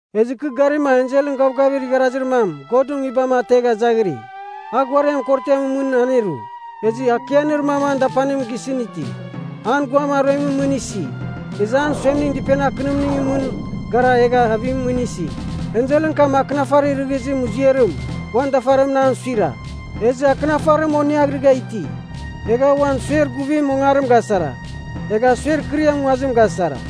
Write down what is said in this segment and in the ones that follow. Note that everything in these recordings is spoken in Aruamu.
Ezɨ kɨ garima enselɨn gavgavir igharazir mam Godɨn Nguibam ategha izaghiri. A ghuariam korotiamɨn mɨn aneru, ezɨ akianir mam an dapanim gisɨn iti. An guam aruemɨn mɨn isi, ezɨ an suemning dɨpenir akɨnimningɨn mɨn gara egha avimɨn mɨn isi. Enselɨn kam akɨnafarir rɨghizir muziarim uan dafarimɨn an suira, ezɨ akɨnafarim oneaghrɨgha iti. Egha a uan suer guvim ongarim gasara, egha suer kɨriam nguazim gasara.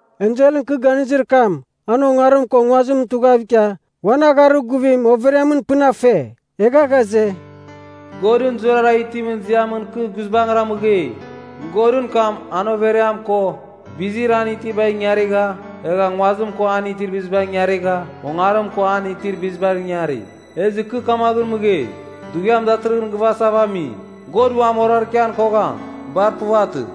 Enselɨn kɨ ganizir kam an ongarim ko nguazimɨn tughav ikia, uan agharir guvim overiamɨn pɨn a fe. Egha ghaze, “Godɨn zurara itimɨn ziamɨn kɨ guizbangɨra mɨgei. Godɨn kam, an overiam ko bizir an itibar ingarigha egha nguazim ko an itir bizibar ingarigha, ongarim ko an itir bizibar ingari. Ezɨ kɨ kamaghɨn mɨgei, dughiam datɨrɨghɨn gɨvasava ami. God uam orarkian kogham. Bar puvatɨ.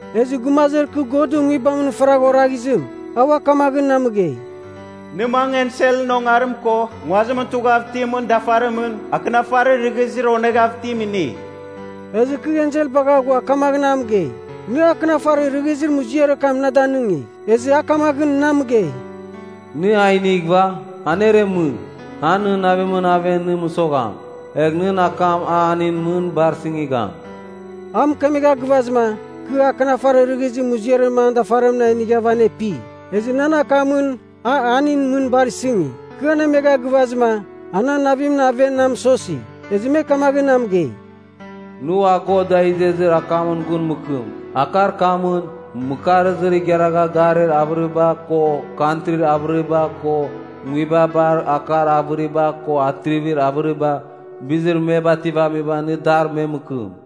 Ezɨ gumazir kɨ Godɨn Nguibamɨn faragha oraghizim, a ua kamaghɨn na mɨgei, “Nɨ mangɨ enselɨn ongarim ko nguazimɨn tughav itimɨn dafarimɨn akɨnafarir rɨghizir oneghav itim inigh.” Ezɨ kɨ ensel bagha ghua kamaghɨn a mɨgei, “Nɨ akɨnafarir rɨghizir muziarir kam na danɨngigh.” Ezɨ a kamaghɨn na mɨgei, “Nɨ a inighɨva, aneremɨ. A nɨn navimɨn aven nɨ mɨsogham. Egh nɨn akamɨn an hanin mɨn bar sɨngigham.” A mɨkemegha gɨvazɨma, kɨ akɨnafarir rɨghizir muziarim an dafarimɨn a inighava anepi. Ezɨ nan akamɨn a hanin mɨn bar sɨngi. Kɨ anemegha gɨvazɨma, a nan navimɨn aven na mɨsosi. Ezɨ me kamaghɨn na mɨgei, “Nɨ ua God da izezir akamɨn gun mɨkɨm. Akar kamɨn, mɨkarzir igharagha garir avɨriba ko kantrin avɨriba ko nguibabar akar avɨriba ko atrivir avɨriba, bizir me bativamiba nɨ dar me mɨkɨm.”